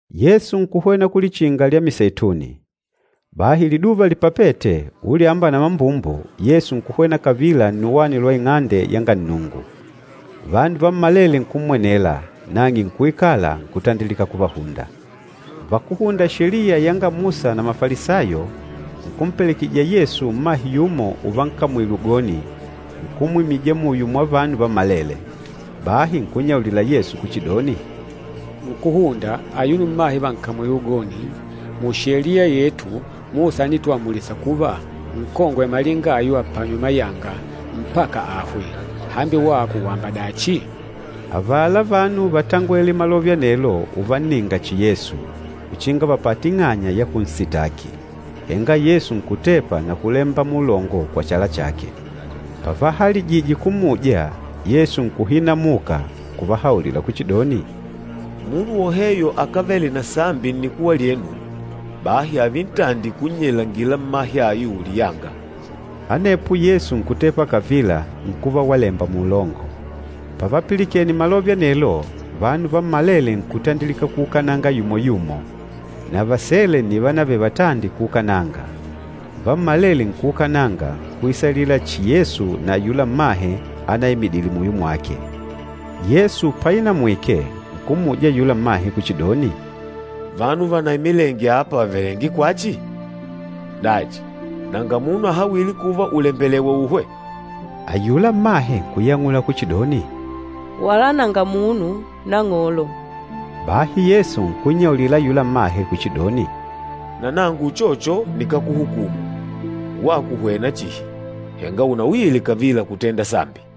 Yesu nkuhwena ku Lichinga lya Miseituni. Bahi liduva lipapete, ulyamba na mambumbu Yesu nkuhwena kavila nnuwani lwa Ing'ande yanga Nnungu. Vanu vammalele nkummwenela, nang'e nkuikala, nkutandilika kuvahunda. Vakúhunda Sheliya yanga Musa na Mafalisayo, nkumpelekejija Yesu mmahe yumo uvankamwile ugoni, nkumwimija muyo mwa vanu vammalele. Bahi nkunnyaulila Yesu kuchidoni, “Nkúhunda, ayuno mmahe vànkamwile ugoni. Mu Sheliya yetu, Musa ánituamulisa kuva, nkongwe malinga ayu apanywe mayanga, mpaka ahwe. Hambi wako wàmba dachi?” Avala vanu vátangwele malove anelo uvanninga chihi Yesu, uchinga vapate ing'anya ya kunsitaki. Henga Yesu nkutepa na kulemba muulongo kwa chala chake. Pavahalijije kummuja, Yesu nkuhinamuka, nkuvahaulila kuchidoni, “Munu woheyo akávele na sambi nnikuwa lyenu, bahi ààve ntandi kunnyelangila mmahe ayu liyanga.” Anepo Yesu nkutepa kavila nkuva walemba muulongo. Pavapilikene malove anelo, vanu vammalele nkutandilika kuukananga yumo-yumo, na vasele nni vánavele vatandi kuukananga. Vammalele nkuukananga nkuisalila chihi Yesu na ayula mmahe anaimidîle muyo mwake. Yesu painamwike nkummuja ayula mmahe kuchidoni, “Vanu vanaimilenge apa vàvelenge kwachi? Dachi, nanga munu ahawîle kuva ùlembelewa uhwe?” Ayula mmahe nkuyang'ula kuchidoni, “Wala nanga munu, Nang'olo!” Bahi Yesu nkunnyaulila ayula mmahe kuchidoni, “Na nangu uchocho nikákuhukumu. Wako hwena chihi, henga unauyile kavila kutenda sambi.”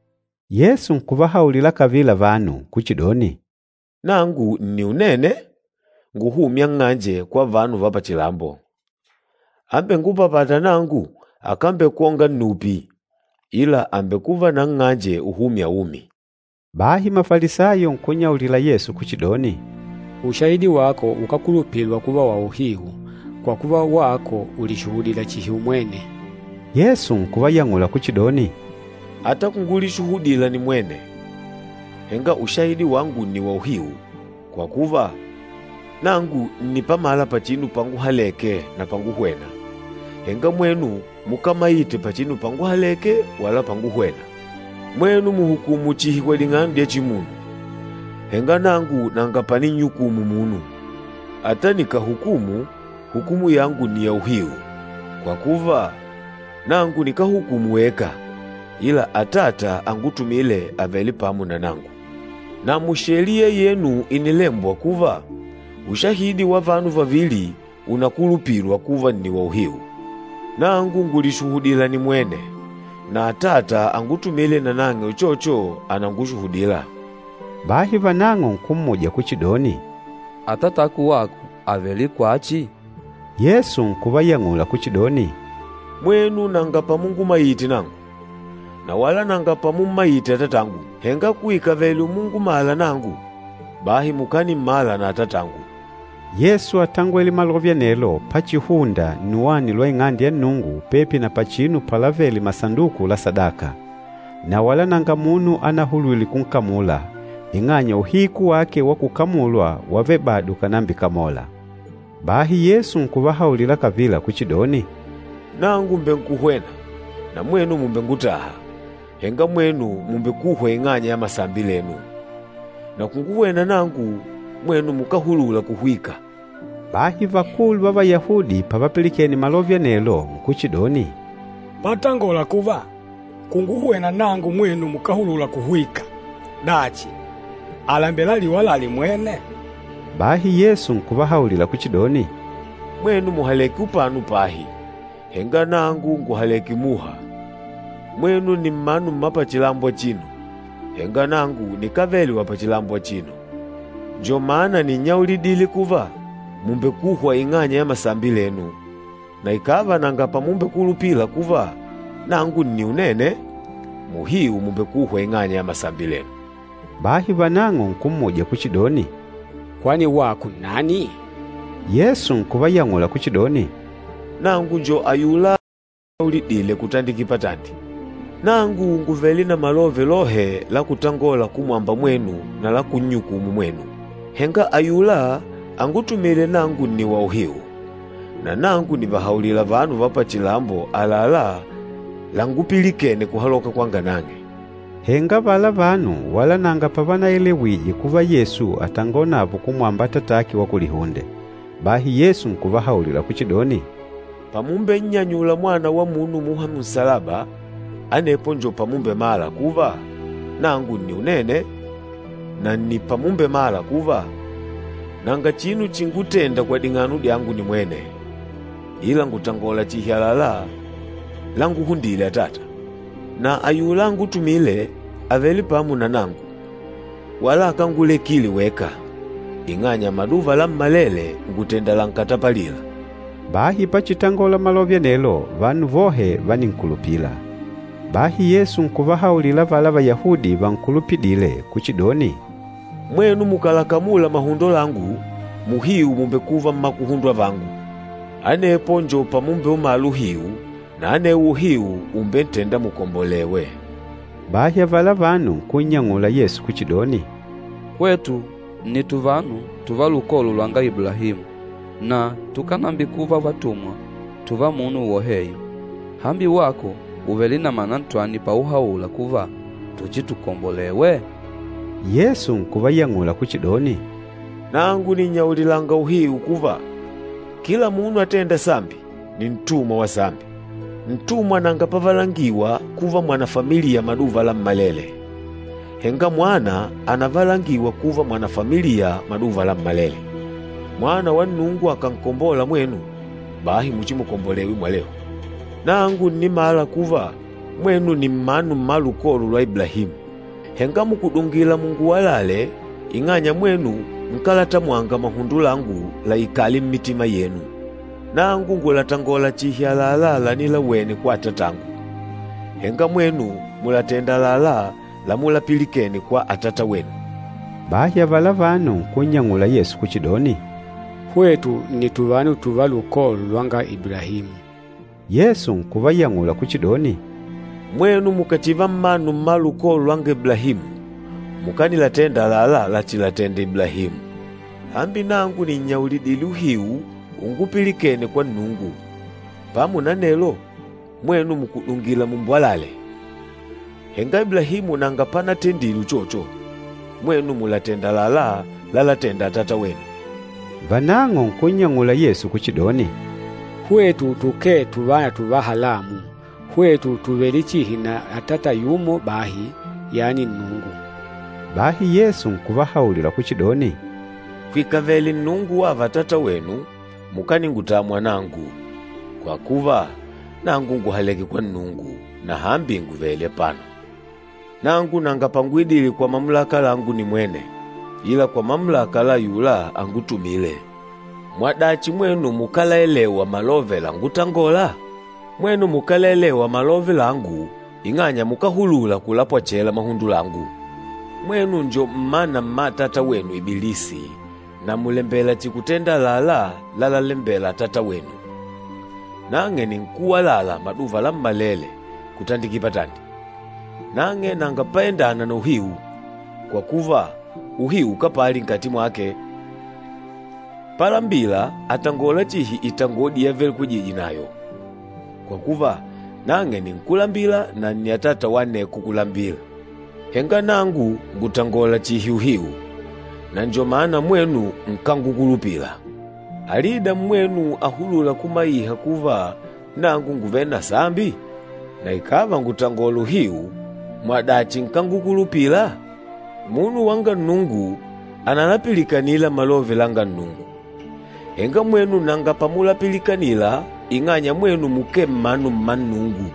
Yesu nkuvahaulila kavila vanu kuchidoni, “Nangu nni Unene nguhûmya nng'anje kwa vanu va pachilambo. Ambengupapâta nangu akambekwonga nnupi, ila àmbekuva na nng'anje uhûmya umi.” Bahi Mafalisayo nkunnyaulila Yesu kuchidoni, “Ushahidi wako ukákulupilwa kuva wa uhiu, kwa kuva wako ulishuhudila chihi umwene.” Yesu nkuvayang'ula kuchidoni, “Ata kungulishuhudila nimwene, henga ushahidi wangu nni wauhiu, kwa kuva, nangu ǹnipamala pachinu panguhaleke na panguhwena. Henga mwenu mukámaite pachinu panguhaleke wala panguhwena. Mwenu mùhukumu chihi kwa ding'ano dya chimunu, henga nangu nanga paninnyukumu munu. Ata nikàhukumu, hukumu yangu ni ya uhiu, kwa kuva, nangu nikáhukumu weka, ila Atata angutumîle àvele pamo na nangu. Na mu Sheliya yenu ìnilembwa kuva, ushahidi wa vanu vavili ùnakulupilwa kuva nni wa uhiu. Nangu ngùlishuhudila nimwene, na Atata angutumîle nanang'e uchocho ànangushuhudila.” Bahi vanang'o nkummuja kuchidoni, “Atatako wako àvele kwachi?” Yesu nkuvayang'ula kuchidoni, “Mwenu nanga pamungumaite nangu, na wala nanga pamummaite Atatangu. Henga kuikavele umungumala nangu, bahi mukanimmala na Atatangu.” Yesu átangwele malove anelo pachihunda nnuwani lwa Ing'ande ya Nnungu pepi na pachinu palavele masanduku la sadaka. Na wala nanga munu anahulwile kunkamula, ing'anya uhiku wake wa kukamulwa wávele bado ukànambikamola. Bahi Yesu nkuvahaulila kavila kuchidoni, “Nangu mbènkuhwena, na mwenu mùmbengutaha, henga mwenu mùmbekuhwa ing'anya ya masambi lenu. Na kunguhwena nangu, mwenu mukáhulula kuhwika.” Bahi vakulu va Vayahudi pavapilikene malove anelo nkuchidoni, “Patangola kuva, ‘Kunguhwena nangu mwenu mukáhulula kuhwika.’ Dachi, àlembela aliwalale mwene?” Bahi Yesu nkuvahaulila kuchidoni, “Mwenu mùhaleke upano pahi, henga nangu ngùhaleke muha. Mwenu ni mmanu mmapachilambo achino, henga nangu nikávele wa pachilambo achino. Njo mana nínnyaulidile kuva, mùmbekuhwa ing'anya ya masambi lenu. Na ikàva nanga pamumbekulupila kuva, ‘Nangu nni Unene,’ muhiu mùmbekuhwa ing'anya ya masambi lenu.” Bahi vanang'o nkummuja kuchidoni, “Kwani wako nnani?” Yesu nkuvayang'ula kuchidoni, “Nangu njo ayula uninannyaulidile kutandiki patandi. Nangu ngùvele na malove lohe la kutangola kumwamba mwenu na la kunnyukumu mwenu. Henga ayula angutumîle nangu nni wauhiu, na nangu nìvahaulila vanu va pachilambo àlalá langupilikene kuhaloka kwanga nang'e.” Henga avala vanu wala nanga pavanaelewije kuva Yesu àtangonavo kumwamba Atatake wa kulihunde. Bahi Yesu nkuvahaulila kuchidoni, “Pamumbennyanyula Mwana wa Munu muha munsalaba, anepo njo pamumbemala kuva, ‘Nangu nni Unene,’ na nni pamumbemala kuva, nanga chinu chingútênda kwa ding'ano dyangu nimwene, ila ngùtangola chihi àlalá langúhundîle Atata. Na ayula angutumîle àvele pamo na nangu, wala akángulekile weka, ing'anya maduva lammalele ngùtenda lankatapalîla.” Bahi pachitangola malove anelo, vanu vohe váninkulupila. Bahi Yesu nkuvahaulila avala Vayahudi vankulupidîle kuchidoni, “Mwenu mukàlakamula mahundo langu, muhiu mùmbekuva mmakuhundwa vangu. Anepo njo pamumbeumala uhiu, na anewo uhiu ùmbentenda mukombolewe.” Bahi avala vanu nkunnyang'ula Yesu kuchidoni, “Hwetu nni tuvanu tùvá lukolo lwanga Iblahimu, na tukánambikuva tuvatumwa tùvá munu woheyo. Hambi wako ùvele na mana ntwani pauhaula kuva, tuchitukombolewe?” Yesu nkuvayang'ula kuchidoni, “Nangu nìnnyaulilanga uhiu kuva, kila munu atênda sambi ni ntumwa wa sambi. Ntumwa nanga pavalangiwa kuva mwanafamiliya maduva lammalele, henga mwana ànavalangiwa kuva mwanafamiliya maduva lammalele. Mwana wa Nnungu akànkombola mwenu, bahi muchimukombolewe mwalehu. Nangu ǹnimala kuva, mwenu ni mmanu mma lukolo lwa Iblahimu. Henga mùkudungila munguwalale ing'anya mwenu nkálatamwanga mahundo langu laikale mmitima yenu. Nangu ngùlatangola chihi àlalá lanilawene kwa Atatangu, henga mwenu mùlatenda àlalá lamulapilikene kwa atatawenu.” Bahi avala vanu nkunnyang'ula Yesu kuchidoni, “Hwetu nni tuvanu tùvá lukolo lwanga Iblahimu.” Yesu nkuvayang'ula kuchidoni, “Mwenu mukàchiva mmanu mma lukolo lwanga Iblahimu, mukanilatenda àlalá lachilatenda Iblahimu. Hambi nangu nìnnyaulidile uhiu unguupilikene kwa Nnungu, pamo na anelo mwenu mùkudungila mumbwalale. Henga Iblahimu nanga panatendile uchocho! Mwenu mùlatenda àlalá lalatenda atatawenu.” Vanang'o nkunnyang'ula Yesu kuchidoni, “Hwetu tukee tuvana tuva halamu! Hwetu tùvele chihi na atata yumo bahi, yani Nnungu.” Bahi Yesu nkuvahaulila kuchidoni, “Kwikavele Nnungu wava Atatawenu, mukaningutamwa nangu, kwa kuva, nangu ngùhaleke kwa Nnungu, na hambi ngùvele apano. Nangu nanga panguidile kwa mamulaka langu nimwene, ila kwa mamulaka la ayula angutumîle. Mwadachi mwenu makálaelewa malove lángutangôla? Mwenu mukálaelewa malove langu ing'anya mukáhulula kulapwechela mahundo langu. Mwenu njo mmana mma atata wenu Ibilisi na mùlembela chihi kutenda àlalá lalalembela atatawenu. Nang'e nni nkúwalala maduva lammalele kutandikila patandi, nang'e nanga paendâna na uhiu, kwa kuva uhiu ukapali nkati mwake. Palambila, àtangola chihi itangodi yavelekwejije nayo, kwa kuva, nang'e ni nkúlambila na nni atata wa aneko kulambila. Henga nangu ngùtangola chihi uhiu, na njo mana mwenu nkángukulupila! Alida mmwenu ahulûla kumaiha kuva nangu ngùvele na sambi? Na ikàva ngùtangola uhiu, mwadachi nkángukulupila? Munu wanga Nnungu ànalapilikanila malove langa Nnungu. Henga mwenu nanga pamupilikanila ing'anya mwenu mukee mmanu mma Nnungu.”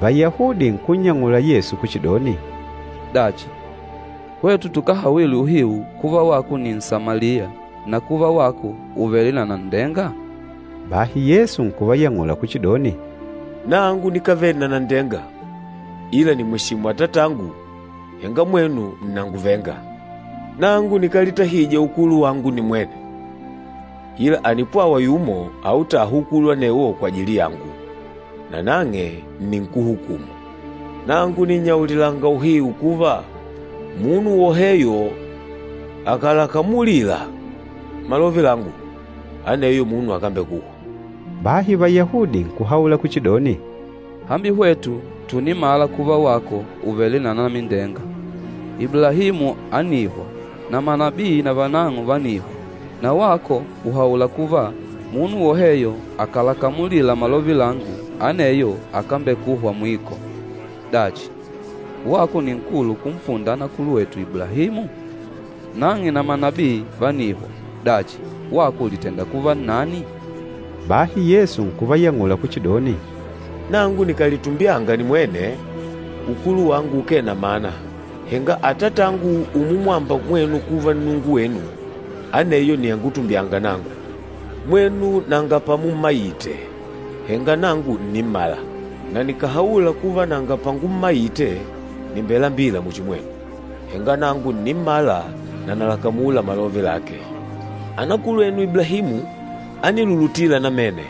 Vayahudi nkunnyang'ula Yesu kuchidoni, “Dachi, hwetu tukáhawile uhiu kuva wako ni Nsamaliya na kuva wako ùvele na nanndenga?” Bahi Yesu nkuvayang'ula kuchidoni, “Nangu nikávele na nanndenga, ila nìmweshimu Atatangu, henga mwenu ǹnanguvenga. Nangu nikálitahija ukulu wangu nimwene, ila ànipwawa yumo autâha ukulu anewo kwajili yangu, nanang'e nni nkúhukumu. Nangu nìnnyaulilanga uhiu kuva, munu woheyo akàlakamulila malove langu, aneyo munu akámbekuhwa.” Bahi Vayahudi nkuhaula kuchidoni, “Hambi hwetu tùnimala kuva wako ùvele na anamindenga! Iblahimu ánihwa, na manabii na vanang'o vánihwa, na wako ùhaula kuva, ‘Munu woheyo akàlakamulila malove langu, aneyo akámbekuhwa mwiko!’ Dachi, wako ni nkulu kumpunda anakulwetu Iblahimu? Nang'e na manabii vánihwa. Dachi, wako ùlitenda kuva nnani?” Bahi Yesu nkuvayang'ula kuchidoni, “Nangu nikàlitumbyanga nimwene, ukulu wangu ukee na mana. Henga Atatangu umumwamba mwenu kuva Nnungu wenu, aneyo nni angutumbyânga nangu. Mwenu nanga pamummaite, henga nangu ǹnimmala. Na nikàhaula kuva, nanga pangummaite, nìmbelambila muchi mwenu. Henga nangu ǹnimmala na nalakamula malove lake. Anakulwenu Iblahimu ánilulutila namene,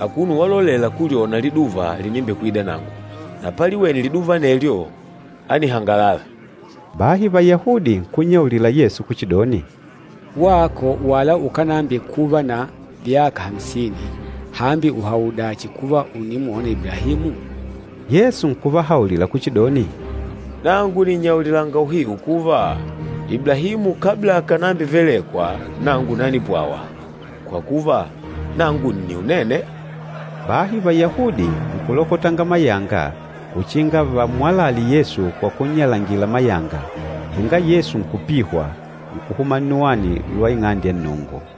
akuno walolela kulyona liduva linimbekwida nangu, na paliwene liduva anelyo, ánihangalala.” Bahi Vayahudi nkunnyaulila Yesu kuchidoni, “Wako wala ukánambikuva na vyaka amsini, hambi ùhaudachi kuva ùnimwona Iblahimu?” Yesu nkuvahaulila kuchidoni, “Nangu nìnnyaulilanga uhiu kuva, Iblahimu kabla akànambivelekwa nangu nanipwawa, kwa kuva, ‘Nangu nni Unene.’” Bahi Vayahudi nkulokotanga mayanga uchinga vammwalale Yesu kwa kunnyalangila mayanga, henga Yesu nkupihwa, nkuhuma nnuwani lwa Ing'ande ya Nnungu.